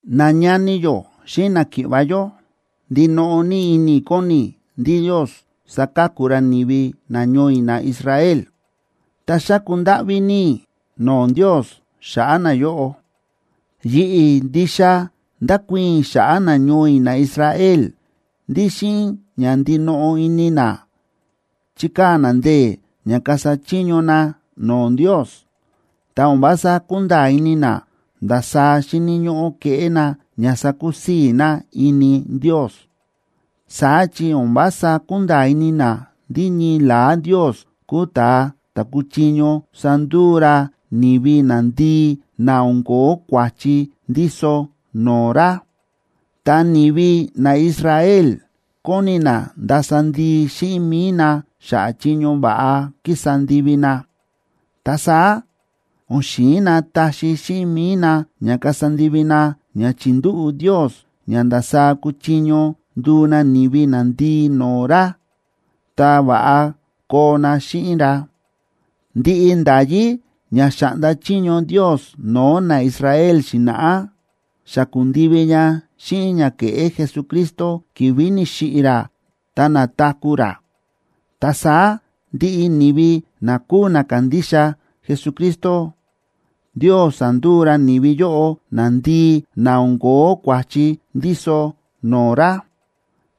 Nañani yó xíꞌin náki̱ꞌva̱ yó, ndinoꞌo ní ini kóni i̱ ndí Ndios saka̱ku ra ni̱vi nañoo i̱ naIsrael. Ta xáku ndáꞌví ní i̱ no̱o̱ Ndios xa̱ꞌa̱ nayóꞌo. Yi̱ꞌi̱ ndixa ndákuii̱n i̱ xa̱ꞌa̱ nañoo i̱ naIsrael ndí xíꞌin ña ndinoꞌo ini na chíkaa̱ na ndee̱ ña kasa chiño na no̱o̱ Ndios, ta o̱n vása kúnda̱a̱ ini na ndasaá xíni̱ ñóꞌó keꞌé na ña sakusii̱ na ini Ndios. Saá chi o̱n vása kúnda̱a̱ ini na ndí ñii la̱á Ndios kúu ta̱a ta̱ kúchiño sanduu ra ni̱vi nandii na o̱n ko̱ó kua̱chi ndíso no̱o̱ ra, ta ni̱vi naIsrael kóni na ndasa ndii xíꞌin mi̱i na xa̱ꞌa̱ chiño va̱ꞌa kísa ndivi na. Ta saá o̱n xi̱in na taxi xíꞌin mi̱i na ña kasa ndivi na ña chi̱ndúꞌu̱ Ndios ña ndasaá kuchiño nduu na ni̱vi nandii no̱o̱ ra ta va̱ꞌa koo na xíꞌin ra. Ndiꞌi nda̱yí ña xa̱ꞌnda chiño Ndios no̱o̱ naIsrael xi̱na̱ꞌá, xa ku̱ndivi ña xíꞌin ña ke̱ꞌé Jesucristo ki̱vi̱ ni̱xiꞌi̱ ra ta na̱taku̱ ra. Ta saá ndiꞌi ni̱vi na kúu na kándixa Jesucristo, Ndios sánduu ra ni̱vi yóꞌo nandii na o̱n ko̱ó kua̱chi ndíso no̱o̱ ra.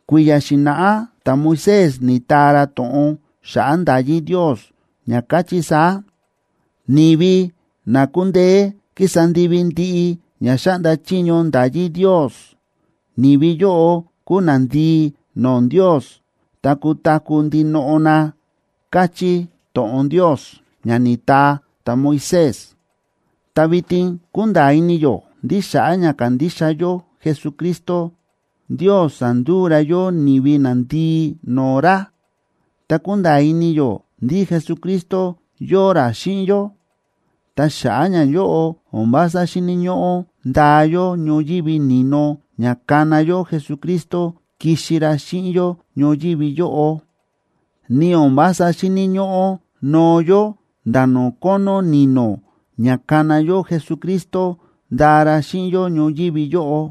Kui̱ya̱ xi̱na̱ꞌá ta̱Moisés ni̱taa ra to̱ꞌon xa̱ꞌa̱ nda̱yí Ndios, ña káchí saá: “Ni̱vi na kúndeé kísa ndivi ndiꞌi ña xáꞌnda chiño nda̱yí Ndios, ni̱vi yóꞌo kuu nandii no̱o̱ Ndios ta kutaku̱ ndinoꞌo na”, káchí to̱ꞌon Ndios ña ni̱taa ta̱Moisés. Ta vitin kúnda̱a̱ ini yó ndí xa̱ꞌa̱ ña kándixa yó Jesucristo, Ndios sa̱nduu ra yó ni̱vi nandii no̱o̱ ra ta kúnda̱a̱ ini yó ndí Jesucristo yóo ra xíꞌin yó. Ta xa̱ꞌa̱ ñayóꞌo, o̱n vása xíni̱ ñóꞌó ndaa yó ñoyívi ni̱no ña kana yó Jesucristo kixi ra xíꞌin yó ñoyívi yóꞌo. Ni o̱n vása xíni̱ ñóꞌó noo yó nda̱ no̱o̱ kónó ni̱no̱, ña kana yó Jesucristo ndaa ra xíꞌin yó ñoyívi yóꞌo.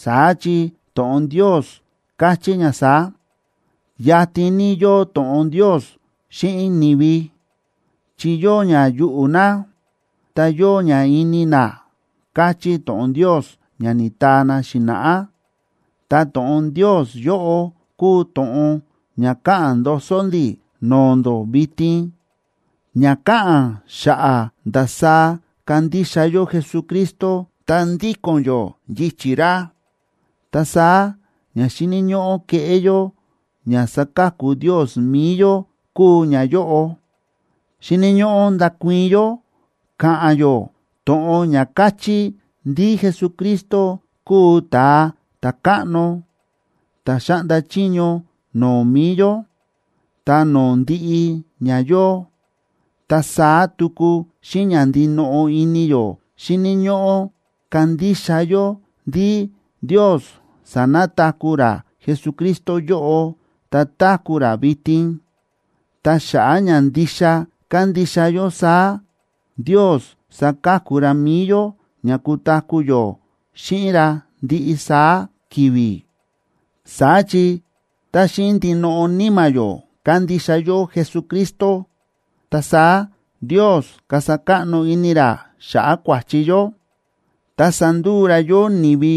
Saá chi to̱ꞌon Ndios káchí ña saá: “Yatin ní yóo to̱ꞌon Ndios xíꞌin ni̱vi, chi yóo ña yuꞌu̱ na, ta yóo ña ini na”, káchí to̱ꞌon Ndios ña ni̱taa na xi̱na̱ꞌá. Ta to̱ꞌon Ndios yóꞌo kúu to̱ꞌon ña káꞌa̱n ndoso ndi̱ no̱o̱ ndó vitin, ña káꞌa̱n xa̱ꞌa̱ ndasaá kándixa yó Jesucristo ta ndíko̱n yó yichi̱ ra. Ta saá ña xíni̱ ñóꞌó keꞌé yó ña saka̱ku Ndios mi̱i yó kúu ñayóꞌo: Xíni̱ ñóꞌó ndakuii̱n yó, ka̱ꞌa̱n yó to̱ꞌon ña káchí ndí Jesucristo kúu Ta̱a Ta̱káꞌno ta̱ xáꞌnda chiño no̱o̱ mi̱i yó, ta no̱o̱ ndiꞌi ña yóo. Ta saá tuku xíꞌin ña ndinoꞌo ini yó xíni̱ ñóꞌó kandixa yó ndí Ndios sa̱nataku̱ ra Jesucristo yóꞌo, ta táku̱ ra vitin. Ta xa̱ꞌa̱ ña ndixa kándixa yó saá, Ndios saka̱ku ra mi̱i yó ña kutaku̱ yó xíꞌin ra ndiꞌi saá ki̱vi̱. Saá chi tá xíꞌin ndinoꞌo níma̱ yó kandixa yó Jesucristo, ta saá Ndios kasa káꞌno ini ra xa̱ꞌa̱ kua̱chi yó, ta sanduu ra yó ni̱vi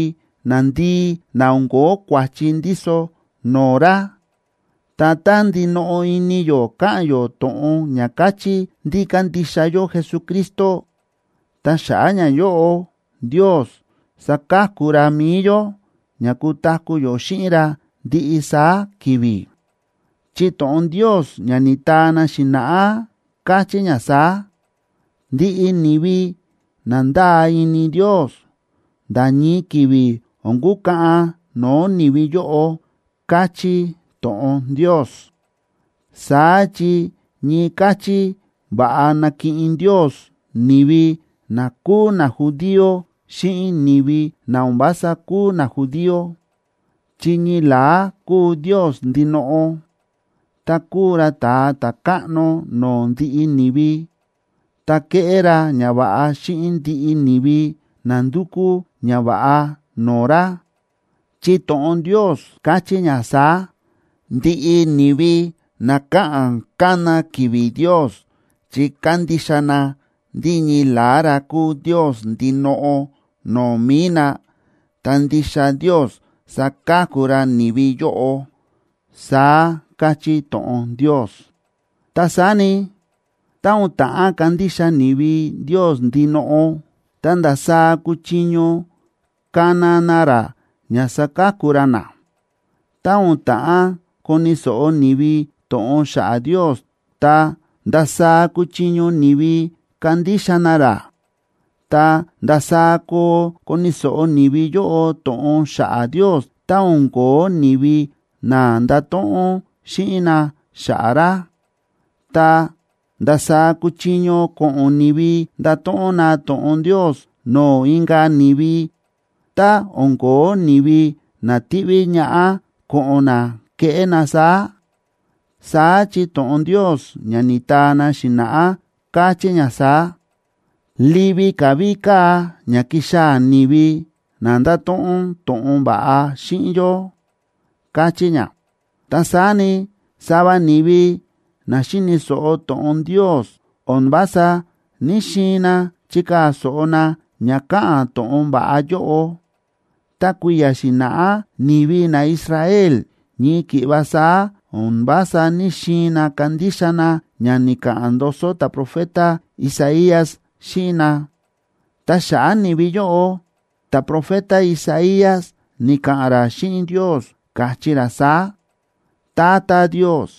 nandii na o̱n ko̱ó kua̱chi ndíso no̱o̱ ra. Ta tá ndinoꞌo ini yó ka̱ꞌa̱n yó to̱ꞌon ña káchí ndí kándixa yó Jesucristo, ta xa̱ꞌa̱ ñayóꞌo Ndios saka̱ku ra mi̱i yó ña kutaku̱ yó xíꞌin ra ndiꞌi saá ki̱vi̱. Chi to̱ꞌon Ndios ña ni̱taa na xi̱na̱ꞌá káchí ña saá: “Ndiꞌi ni̱vi na ndáa ini Ndios, nda̱ ñii ki̱vi̱ o̱n kukaꞌan no̱o̱ ni̱vi yóꞌo”, káchí to̱ꞌon Ndios. Saá chi ñii káchí va̱ꞌa nákiꞌin Ndios ni̱vi na kúu najudío xíꞌin ni̱vi na o̱n vása kúu najudío,a chi ñii la̱á kúu Ndios ndinoꞌo, ta kúu ra Ta̱a Ta̱káꞌno no̱o̱ ndiꞌi ni̱vi, ta kéꞌé ra ñava̱ꞌa xíꞌin ndiꞌi ni̱vi na ndúkú ñava̱ꞌa no̱o̱ ra. Chi to̱ꞌon Ndios káchí ña saá: “Ndiꞌi ni̱vi na káꞌa̱n kána ki̱vi̱ Ndios chi kándixa na ndí ñii la̱á ra kúu Ndios ndinoꞌo no̱o̱ mi̱i na, ta ndixa Ndios saka̱ku ra ni̱vi yóꞌo”, saá káchí to̱ꞌon Ndios. Ta saá ni, tá o̱n ta̱ꞌán kandixa ni̱vi Ndios ndinoꞌo, ta, ¿ndasaá kuchiño kana na ra ña saka̱ku ra na? Tá o̱n ta̱ꞌán koni̱ so̱ꞌo ni̱vi to̱ꞌon xa̱ꞌa̱ Ndios, ta, ¿ndasaá kuchiño ni̱vi kandixa na ra? Ta, ¿ndasaá koo koni̱ so̱ꞌo ni̱vi yóꞌo to̱ꞌon xa̱ꞌa̱ Ndios, tá o̱n ko̱ó ni̱vi na ndato̱ꞌon xíꞌin na xa̱ꞌa̱ ra? Ta, ¿ndasaá kuchiño ko̱ꞌo̱n ni̱vi ndato̱ꞌon na to̱ꞌon Ndios no̱o̱ inka̱ ni̱vi, tá o̱n ko̱ó ni̱vi na tiꞌví ñaꞌá ko̱ꞌo̱n na keꞌé na saá? Saá chi to̱ꞌon Ndios ña ni̱taa na xi̱na̱ꞌá káchí ña saá: “¡Livi ka̱ ví káa ña ki̱xaa̱ ni̱vi na ndato̱ꞌon to̱ꞌon va̱ꞌa xíꞌin yó!”, káchí ña. Ta saá ni, sava ni̱vi na xi̱ni̱ so̱ꞌo to̱ꞌon Ndios, o̱n vása ní‑xiin na chikaa̱ so̱ꞌo na ña káꞌa̱n to̱ꞌon va̱ꞌa yóꞌo. Ta kui̱ya̱ xi̱na̱ꞌá ni̱vi naIsrael ñii ki̱ꞌva saá o̱n vása ní‑xiin na kandixa na ña ni̱ka̱ꞌa̱n ndoso ta̱profeta Isaías xíꞌin na. Ta xa̱ꞌa̱ ni̱vi yóꞌo, ta̱profeta Isaías ni̱ka̱ꞌa̱n ra xíꞌin Ndios, káchí ra saá: “Tata Ndios,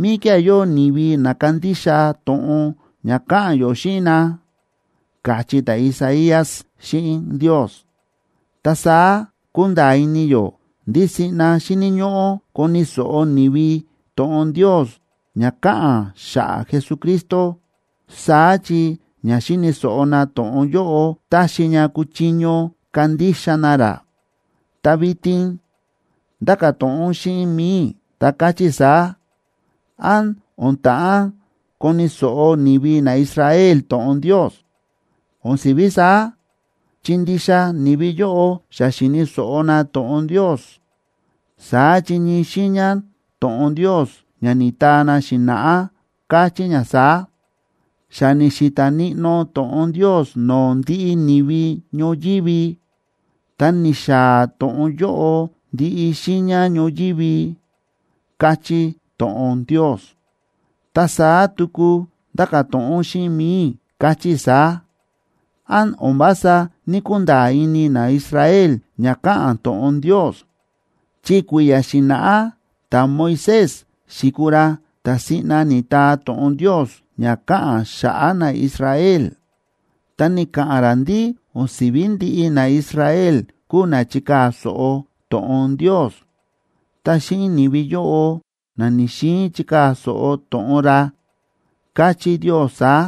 ¿míkía̱ yóo ni̱vi na kándixa to̱ꞌon ña káꞌa̱n yó xíꞌin na?”, káchí ta̱Isaías xíꞌin Ndios. Ta saá kúnda̱a̱ ini yó ndí siꞌna xíni̱ ñóꞌó koni̱ so̱ꞌo ni̱vi to̱ꞌon Ndios ña káꞌa̱n xa̱ꞌa̱ Jesucristo, saá chi ña xi̱ni̱ so̱ꞌo na to̱ꞌon yóꞌo táxi ña kuchiño kandixa na ra. Ta vitin ndáka̱ to̱ꞌon xíꞌin mi̱i i̱, ta káchí i̱ saá: ¿Án o̱n ta̱ꞌán koni̱ so̱ꞌo ni̱vi naIsrael to̱ꞌon Ndios? ¡O̱n si̱ví saá!, chi ndixa ni̱vi yóꞌo xa xi̱ni̱ so̱ꞌo na to̱ꞌon Ndios. Saá chi ñii xiiña to̱ꞌon Ndios ña ni̱taa na xi̱na̱ꞌá káchí ña saá: Xa ni̱xi̱ta̱ níꞌnó to̱ꞌon Ndios no̱o̱ ndiꞌi ni̱vi ñoyívi, ta ni̱xaa̱ to̱ꞌon yóꞌo ndiꞌi xiiña ñoyívi, káchí to̱ꞌon Ndios. Ta saá tuku ndáka̱ to̱ꞌon xíꞌin mi̱i i̱, káchí i̱ saá: ¿Án o̱n vása ní‑kunda̱a̱ ini naIsrael ña káꞌa̱n to̱ꞌon Ndios? Chi kui̱ya̱ xi̱na̱ꞌá ta̱Moisés xi̱kuu ra ta̱ siꞌna ni̱taa to̱ꞌon Ndios ña káꞌa̱n xa̱ꞌa̱ naIsrael, ta ni̱ka̱ꞌa̱n ra ndí o̱n si̱ví ndiꞌi naIsrael kuu na chikaa̱ so̱ꞌo to̱ꞌon Ndios. Ta xíꞌin ni̱vi yóꞌo na ni̱‑xiin chikaa̱ so̱ꞌo to̱ꞌon ra, káchí Ndios saá: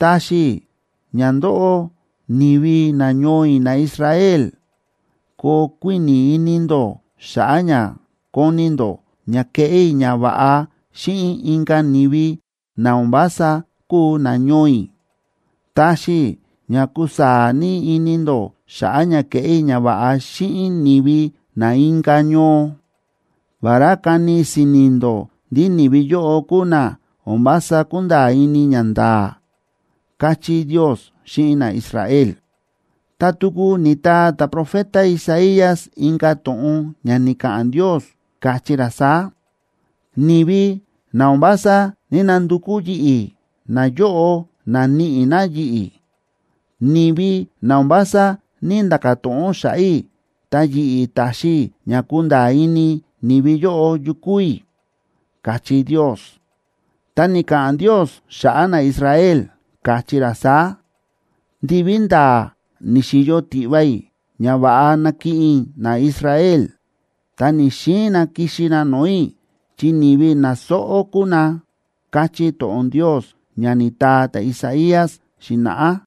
Taxi i̱ ña ndóꞌó, ni̱vi nañoo i̱ naIsrael, koo kuíni̱ ini ndó xa̱ꞌa̱ ña koni ndó ña keꞌé i̱ ñava̱ꞌa xíꞌin inka̱ ni̱vi, na o̱n vása kúu nañoo i̱. Taxi i̱ ña kusaa̱ ní ini ndó xa̱ꞌa̱ ña keꞌé i̱ ñava̱ꞌa xíꞌin ni̱vi na inka̱ ñoo, vará kani si̱ni̱ ndó ndí ni̱vi yóꞌo kúu na o̱n vása kúnda̱a̱ ini ñanda̱a̱, káchí Ndios xíꞌin naIsrael. Ta tuku ni̱taa ta̱profeta Isaías inka̱ to̱ꞌon ña ni̱ka̱ꞌa̱n Ndios, káchí ra saá: Ni̱vi na o̱n vása ní‑nandukú yi̱ꞌi̱, nayóꞌo na̱níꞌi na yi̱ꞌi̱. Ni̱vi na o̱n vása ní‑nda̱ka̱ to̱ꞌon xa̱ꞌa̱ i̱, ta yi̱ꞌi̱, ta̱xi i̱ ña kunda̱a̱ ini ni̱vi yóꞌo yu kúu i̱, káchí Ndios. Ta ni̱ka̱ꞌa̱n Ndios xa̱ꞌa̱ naIsrael, káchí ra saá: “Ndiví ndaa ni̱xi̱yo tiꞌva i̱ ña va̱ꞌa nakiꞌin i̱ naIsrael, ta ni̱‑xiin na kixi na no̱o̱ i̱, chi ni̱vi na sóꞌó kúu na”, káchí to̱ꞌon Ndios ña ni̱taa ta̱Isaías xi̱na̱ꞌá.